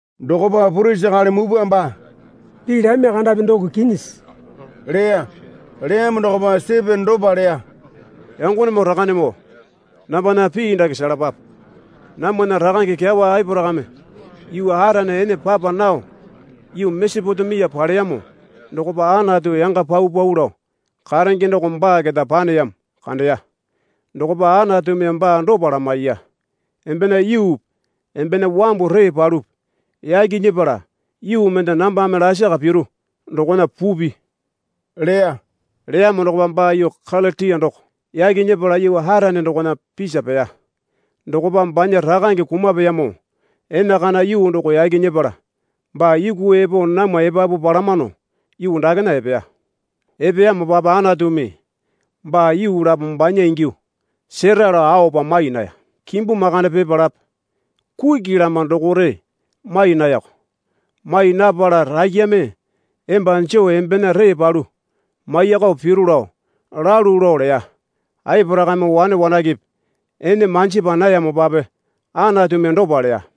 Dokopa purisi akali mupwa baa, Pii lami kandapi doko kinyisi? leya. Leyamo dokopa Sitipena dopa leya. Yangonemoo rakanemoo nambana pii dake selapape. Namwana rakange kyawa Aporakame yuu Arane ene papa nao yuu Mesopotemia paleyamo dokopa Anatu yanga paupau lao karenge doko baa keta paneyamo kandeya. Dokopa Anatumi baa dopa lamaiya. Embena yuupi embena wambu ree palupi yaki nyepala yuu mende nambame lasaka piru dokona pupi leya. Leyamo dokopa baa yuu Kalitiya doko yaki nyepala yuu Arane dokona pisa peya. Dokopa banya rakange kumapeyamo enakana yuu doko yaki nyepala baa yuku epo namwa epapu palamano yuu dakena epeya. Epeyamopape Anatumi baa yuu lapo banya ingyuo sera alo aopa mai naya. Kimbu makande pipalape kuki lama dokore mai nayako. Mai napala, Rakyame emba joo embena ree palu maiyakao piru lao lalu lao leya. Aporakame wane wanakepe ene manjapa nayamopape Anatumi dopa leya.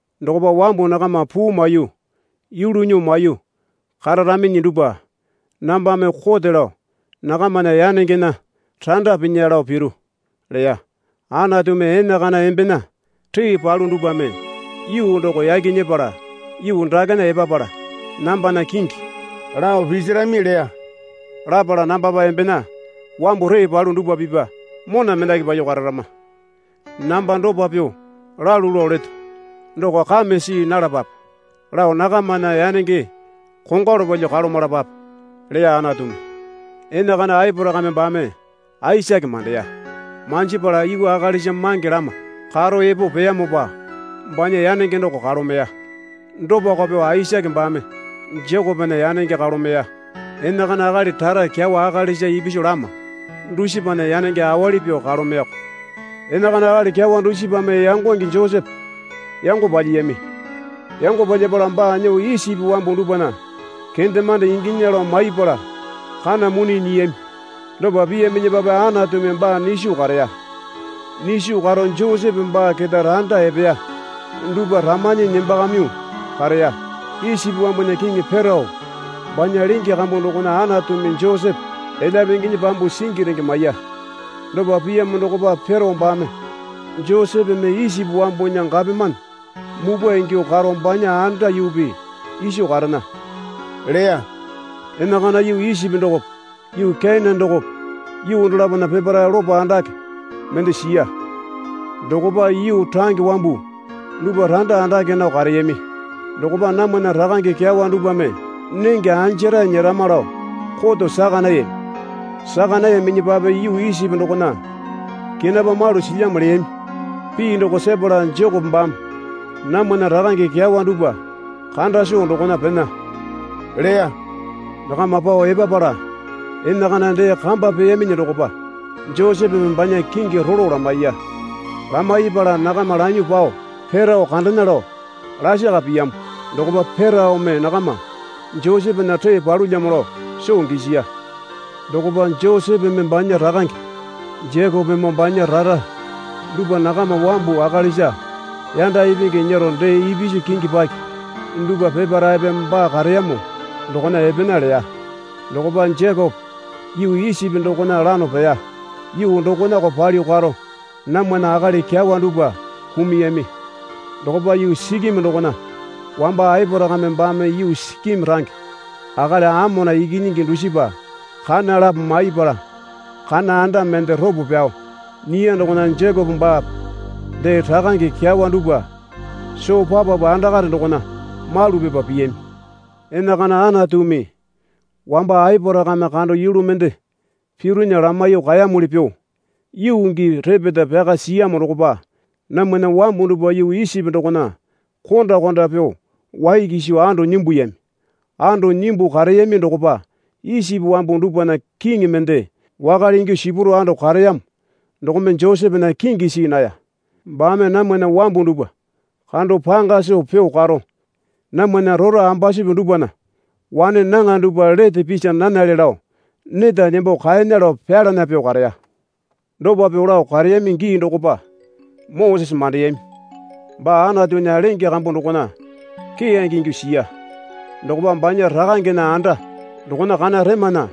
Dokopa wambu nakama puu maiyuo yulu nyuo maiyuo kararaminyi dupwa nambame kote lao nakamana yanengena randa pinya lao piru, leya Anatumi. Enakana embena ree palu dupwame yuu doko yaki nyepala yuu dakena epapala nambana kingi lao pisirami leya. Lapala, Nambapa embena wambu ree palu dupwa pipya mona mendaki palyuo kararama. Namba dopa pyuo lalu lao leto doko kame see nalapape lao nakamana yanenge kongwalu palyuo kalomalapape, leya Anatumi. Enakana Aporakame baame Aisake mandeya. Manjipala yuu akalisa mange lama karo epo peyamopa banya yanenge doko kalomeya. Dopako pyuo Aisake baame Jekopena yanenge kalomeya. Enakana akali rara kyawa akalisa ipisu lama dusipana yanenge awali pyuo kalomeyako. Enakana akali kyawa dusipame yangonge Josepe yango palyiyami. Yango palyapala baa nyuo Isipi wambu dupwana kendemande inginya lao maipala kana mone nyiyami. Dopa piyaminyipape Anatumi baa nyiso kareya. Nyiso karo Josepe baa keta randa epeya dupwa ramanyi nembakamyuo kareya. Isipi wambunya kiŋi Perao banya lenge kambu dokona Anatumi Josepe elyape inginyi pyambuo singi renge maiya. Dopa piyamo dokopa Perao baame Josepeme Isipi wambunya gapomane mupwa ingyuo karo banya anda yuupi iso karena leya. Enakana yuu Isipi dokope yuu Kenane dokope yuu dolapona peparae lopo andake mende siya. Dokopa yuu range wambu dupwa randa andake nao kareyami. Dokopa namwana rakange kyawa dupwame nenge anjarae nyerama lao koto saka nayami. Saka nayaminyipape yuu Isipi dokona kenapa malu silyamo leyami pii doko sepala Jekope baame namwana rakange kyawa dupwa kanda soo dokona pena leya. Nakama pao epapala enakana dee kamba peyaminyi dokopa Josepeme banya kingi rolo lamaiya. Lamaipala nakama lanyuo pao Perao kandena lao lakara piyamo dokopa Peraome nakama Josepena ree palulyamo lao soo gisiya. Dokopa Josepeme banya rakange Jekopemoo banya rara dupwa nakama wambu akalisa yanda ipingi nyero dee ipisu kingi paki dupwa peparaepe baa kareyamo dokona epena leya. Dokopa Jekope yuu Isipi dokona lano peya. Yuu dokonako palyuo karo namwana akali kyawa dupwa kumuyami. Dokopa yuu Sikeme dokona wamba Aporakame baame yuu Sikeme range akali Amona ikinyingi dusipa kana lapo maipala kana anda mende ropo pyao nyiya dokona Jekope baape dee rakange kyawa dupwa soo papapu andakare dokona malu pipa piyami. Enakana Anatumi wamba Aporakame kando yulu mende pirunya lamaiyuo kaeyamuli pyuo yuu gii repeta pyaka siyamo dokopa namwana wambu dupwa yuu Isipi dokona konda konda pyuo wai kiso ando nyimbuyami. Ando nyimbuo kareyami dokopa Isipi wambu dupwana kiŋi mende wakale ingyuo sipuro ando kareyamo dokome Josepena kingi see naya. Baame namwana wambu dupwa kando panga soo pyuo karo namwana rora ambasupi dupwana wane nyaŋa dupwa lete pisi nanale lao neta nembo kaena lao pyalana pyuo kareya. Dopa pyuo lao kareyami gii dokopa Mosese mandeyami. Baa Anatunya lenge kambu dokona keyange ingyuo siya. Dokopa banya rakangena anda dokona kana remana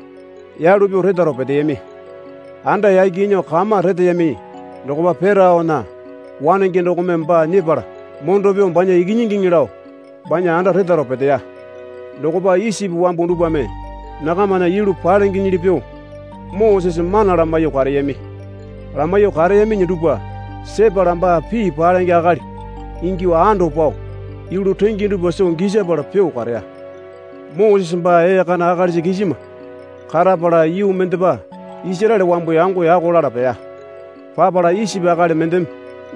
yalu pyuo retaro peteyami. Anda yaki nyuo kama reteyami dokopa Peraona wanenge dokome baa nyepala mondo pyuo banya ikinyingiŋi lao banya anda retaro peteya. Dokopa Isipi wambu dupwame nakamana yulu palengenyili pyuo Mosese mana lamaiyuo kareyami. Lamaiyuo kareyaminyi dupwa sepala baa pii palenge akali ingyuo ando pao yulu renge dupwa soo gisapala pyuo kareya. Mosese baa ee kana akalisa kisima karapala yuu mendepa Isaraele wambu yango yako lala peya. Papala Isipi akali mendeme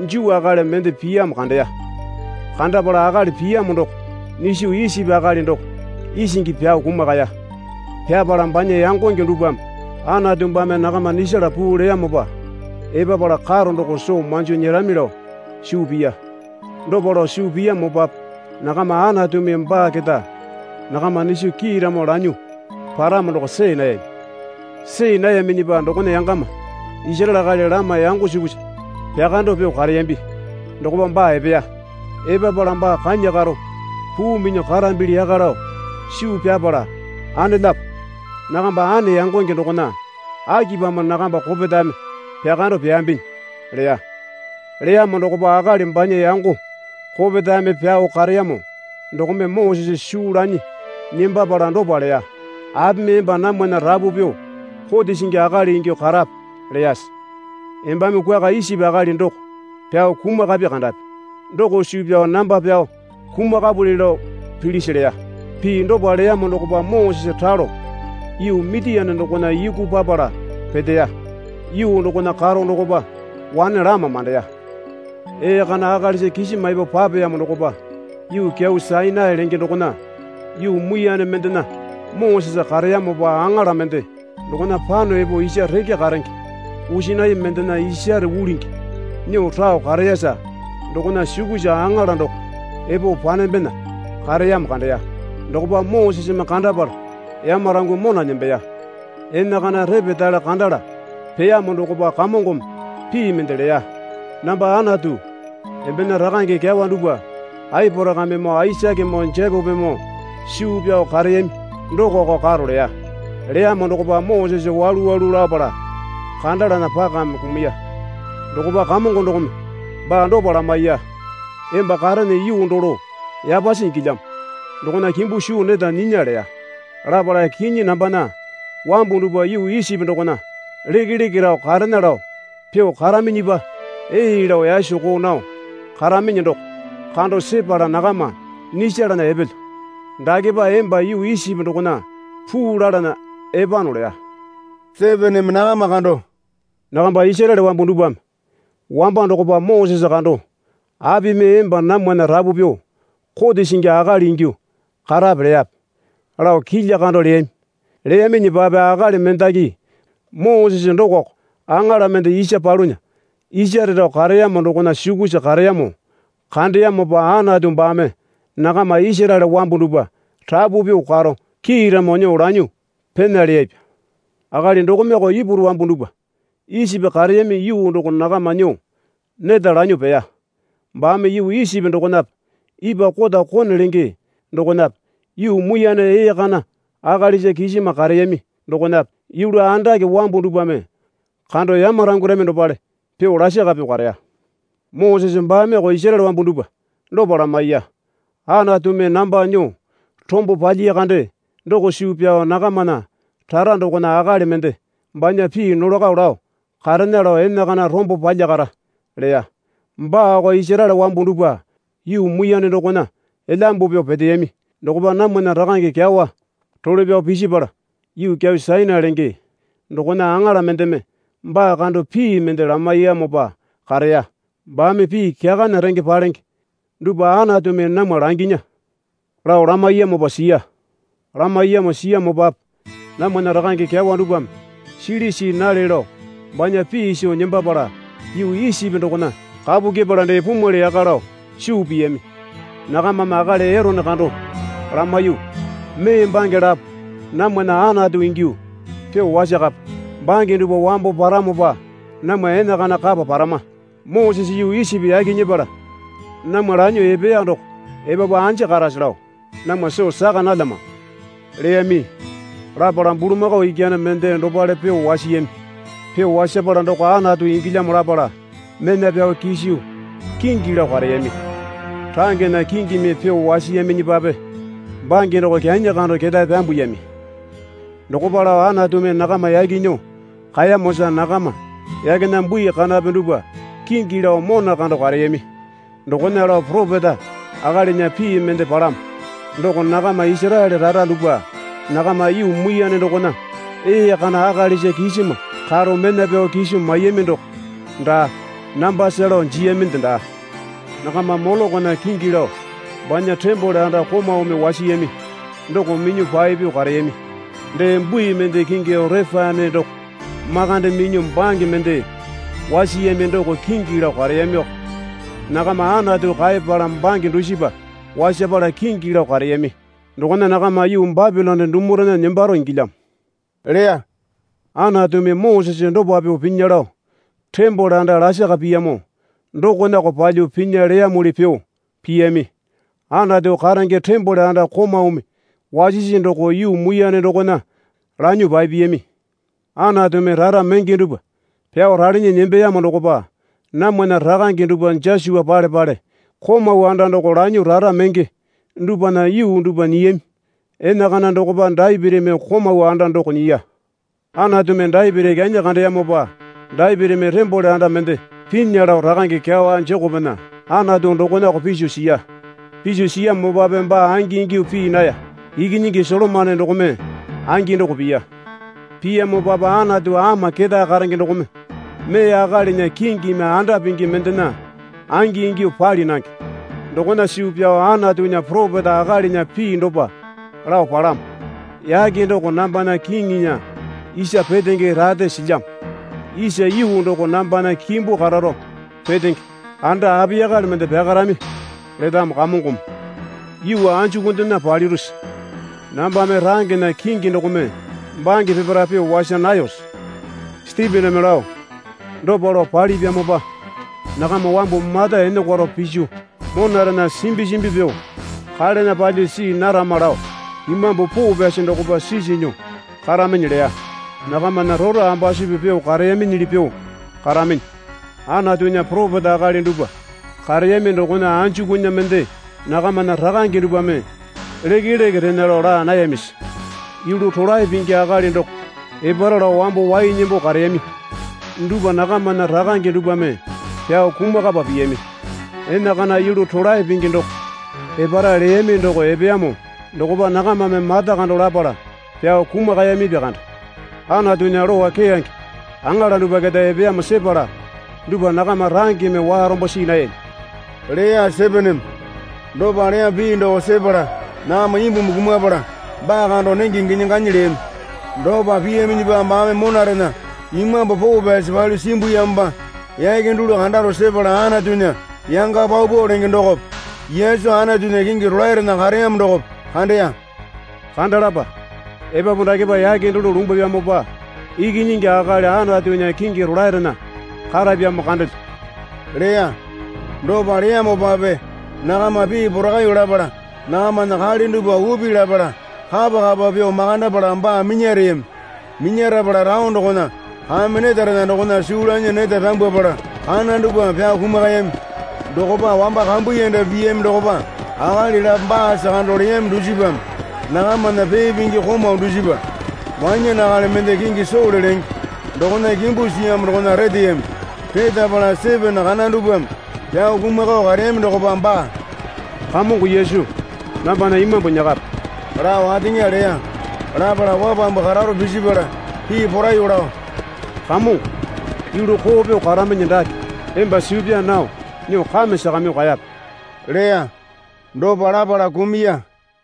Juu akali mende piyamo kandeya. Kandapala akali piyamo doko nyiso Isipi akali doko isingi pyao kumakaya. (Pyapala banya yangonge dupwame Anatu baame nakama nyisala puu leyamopa epapala karo doko soo manjo nyerami lao suu piya. Dopa lao suu piyamopape nakama Anatumi baa keta nakama nyiso kiiramo lanyuo paramo doko see nayami.) See nayaminyipa dokona yangama Isaraele akali lama yango sukusa pyakando pyuo kareyambi dokopa baa epeya. Epapala baa kanya karo puu minyuo karambili yaka lao suu pyapala, Anelapo, nakamba ane yangonge dokona akipamo nakamba kopetame pyakando pyaambinyi? leya. Leyamo dokopa akali banya yango kopetame pyao kareyamo dokome Mosese suu lanyi nembapala dopa leya. Apimi emba namwana rapu pyuo kote singi akali ingyuo karape leyase? Embame kwuaka Isipi akali doko pyao kumakapi kandapi doko suu pyao namba pyao kumakapuli lao pilisi? leya. Pii dopa leyamo dokopa Mosese ralo yuu Mitiane dokona yuku papala peteya. Yuu dokona karo dokopa wane lama mandeya. Ee kana akalisa kisima epo papeyamo dokopa yuu kyau Sainai lenge dokona yuu muiyane mendena Mosese kareyamopa aŋala mende dokona pano epo isa reke karenge pusinai mendena isare ulingi nyuo rao kareyasa dokona sukusa aŋala doko epo panembena kareyamo kandeya. Dokopa Moseseme kandapala yamarangyuo mona nembeya. Enakana repetale kandala peyamo dokopa Kamongome pii mende leya. Namba Anatu embena rakange kyawa dupwa Aporakamemoo Aisakemoo Jekopemoo suu pyao kareyami dokoko karo leya. Leyamo dokopa Mosese walu walu lapala kandalana pakame kumuya. Dokopa Kamongo dokome baa dopa lamaiya. Emba karene yuu dolo yapasi ingilyamo dokona kimbu suu neta nyinya leya. Lapala, Kinyi, nambana wambu dupwa yuu Isipi dokona lekeleke rao karena lao pyuo karaminyipa ee lao yasoko nao karaminyi doko kando sepala nakama nyisalana epelyo. Dakepa emba yuu Isipi dokona puu lalana epano leya. Sitipename nakama kando, Nakamba Isaraele wambu dupwame wamba dokopa Mosese kando, Apimi emba namwana rapu pyuo kote singi akali ingyuo karape leyape? lao kilya kando leyami. Leyaminyipape akali mendaki Mosese dokoko aŋala mende isa palunya isare rao kareyamo dokona sukusa kareyamo kandeyamopa Anatu baame nakama Isaraele wambu dupwa rapu pyuo karo kiiramo nyuo lanyuo pena leyapya. Akali dokomeoko Ipuru wambu dupwa Isipi kareyami yuu doko nakama nyuo neta lanyuo peya. Baame yuu Isipi dokonape ipwa kota Kone lenge dokonape yuu muiyane ee kana akalisa kisima kareyami dokonape yulu andake wambu dupwame kando yamarangwarami dopale pyuo lasaka pyuo kareya. Mosese baameko Isaraele wambu dupwa dopa lamaiya. Anatumi namba nyuo rombo palyiya kande doko suu pyao nakamana rara dokona akali mende banya pii nolako lao karena lao enakana rombo palyakara, leya. Baako Isaraele wambu dupwa yuu muiyane dokona elyambu pyuo peteyami dokopa namwana rakange kyawa role pyao pisipala yuu kyau Sainai lenge dokona aŋala mendeme baa kando pii mende lamaiyamopa kareya. Baame pii kyakana renge palenge dupwa Anatumi namwa langinya lao lamaiyamopa siya. Lamaiyamo siyamopape namwana rakange kyawa dupwame sili see nale lao banya pii soo nembapala yuu Isipi dokona kapu kyepala dee pumwali yaka lao suu piyami. Nakamame akali Erone kando lamaiyuo, Mee bange lapo namwana anatu ingyuo pyuo wasakape. Bange dupwa wambo paramopa namwa enakana kapa parama. Mosese yuu Isipi yaki nyepala namwa lanyuo epeya doko epapu anja karase lao namwa soo saka nalyamano, leyami. Lapala bulamakao ikyane mende dopale pyuo wasiyami. Pyuo wasapala doko anatu ingilyamo lapala mena pyao kiso kingi lao kareyami. Rangena kingimi pyuo wasiyaminyipape bange doko kyanyi kando ketae pyambuyami. Dokopa lao Anatumi nakama yaki nyuo kaeyamosa nakama yakena bui kanape dupwa kingi lao mona kando kareyami. Dokona lao poropeta akalinya pii mende palamo. Doko nakama Isaraele rara dupwa nakama yuu muiyane dokona ee kana akalisa kisima karo mena pyao kiso maiyami doko daa nambasa lao jiyaminde daa. Nakama Molokona kingi lao banya tembole anda komaumi wasiyami doko minyuo papyuo kareyami. Dee bui mende kingi Orepane doko makande minyuo bange mende wasiyami doko kingi lao kareyamioko. Nakama Anatu kaeyapala bange dusipa wasapala kingi lao kareyami dokona nakama yuu Bapilone dumurena nembaro ingilyamo leya. Anatumi Mosese dopa pyuo pinya lao tembole anda lasaka piyamo dokonako palyuo pinya leyamuli pyuo piyami. Anatu karenge tembole anda komaumi wasisi doko yuu muiyane dokona lanyuo papiyami. Anatumi rara menge dupwa pyao ralinyi nembeyamo dokopa namwana rakange dupwa Josua pale pale komau anda doko lanyuo rara menge dupwana yuu dupwa nyiyami. Enakana dokopa Dapitimi komau anda doko nyiya. Anatumi Dapiti kyanyi kandeyamopa Dapitimi tembole anda mende pinya lao rakange kyawa Jekopena Anatu dokonako piso siya. Piso siyamopape baa angingyuo pii naya. Ikinyingi Solomone dokome angi doko piya. Piyamopape Anatu Ama Ketae Karenge dokome mee akalinya kingimi anda pingi mendena angingyuo pali nange. Dokona suu pyao Antunya poropeta akalinya pii dopa lao palamo. Yake doko nambana kiŋinya isa petenge rate silyamo isa yuu doko nambana kimbu kararo petenge. Anda apiyakale mende pyakarami? letamo Kamongome. Yuu anjukundena palirusi? Nambame rangena kingi dokome bange peparae pyuo wasa nayose? Sitipename lao, Dopa lao palipyamopa nakama wambu mata enokwaro piso monarena simbi simbi pyuo kalena palyuo see narama lao Imambu Poo Pyasi dokopa sisi nyuo karaminyi leya. Nakamana rora ambusipi pyuo kareyaminyili pyuo karaminyi. Anatunya poropeta akali dupwa kareyami dokona anjukunya mende nakamana rakange dupwame lekeleke rena lao laa nayamisi? Yulu rolae pingi akali doko epara lao wambo wai nembo kareyami dupwa nakamana rakange dupwame pyao kumakapa piyami. Enakana yulu rolae pingi doko epara leyami doko epeyamo dokopa nakamame mata kando lapala pyao kumakayamipya kande. Anatunya lowa keyange aŋala dupwa keta epeyamo sepala dupwa nakama rangeme warombo see nayami, leya Sitipename. Dopa leyamo pii doko sepala nakama imbumi kumapala baa kando nenge ginyi ganyi leyami. Dopa piyaminyipa baame monarena Imambu Poo Pyasi palyuo simbuyamopa yake dulu kandaro sepala Anatunya yanga paupau lenge dokope Yesu Anatunya kingi rolaerena kareyamo dokope kandeya. Kandalapa, Epapu dakepa yake dulu lumbwapyamopa Ikinyingi Akali Anatunya kingi rolaerena karapyamo kandelyo leya. Dopa leyamopape nakama pii porakaiyuo lapala nakamana kale dupwa upi lapala kapa kapa pyuo makandapala baa minyareyami. Minyarapala taone dokona kame netarena dokona suu lanyi neta pyambwapala kana dupwame pyao kumakayami. Dokopa wamba kambuyanda piyami dokopa akali lapo baasa kando leyami dusipame nakamana pee pingi komau dusipa wanyane akali mende kingi Sole lenge dokona kimbu siyamo dokona reteyami. Retapala Sitipena kana dupwame pyao kumakao kareyami dokopa baa, Kamongo Yesu, nambana imambu nyakape, lao ateŋa leya. Lapala wapambu kararo pisipala pii poraiyuo lao, Kamongo, yulu koo pyuo karaminyi dake emba suu pyaa nao nyuo kame sakamyuo kaeyape, leya. Dopa lapala kumuya.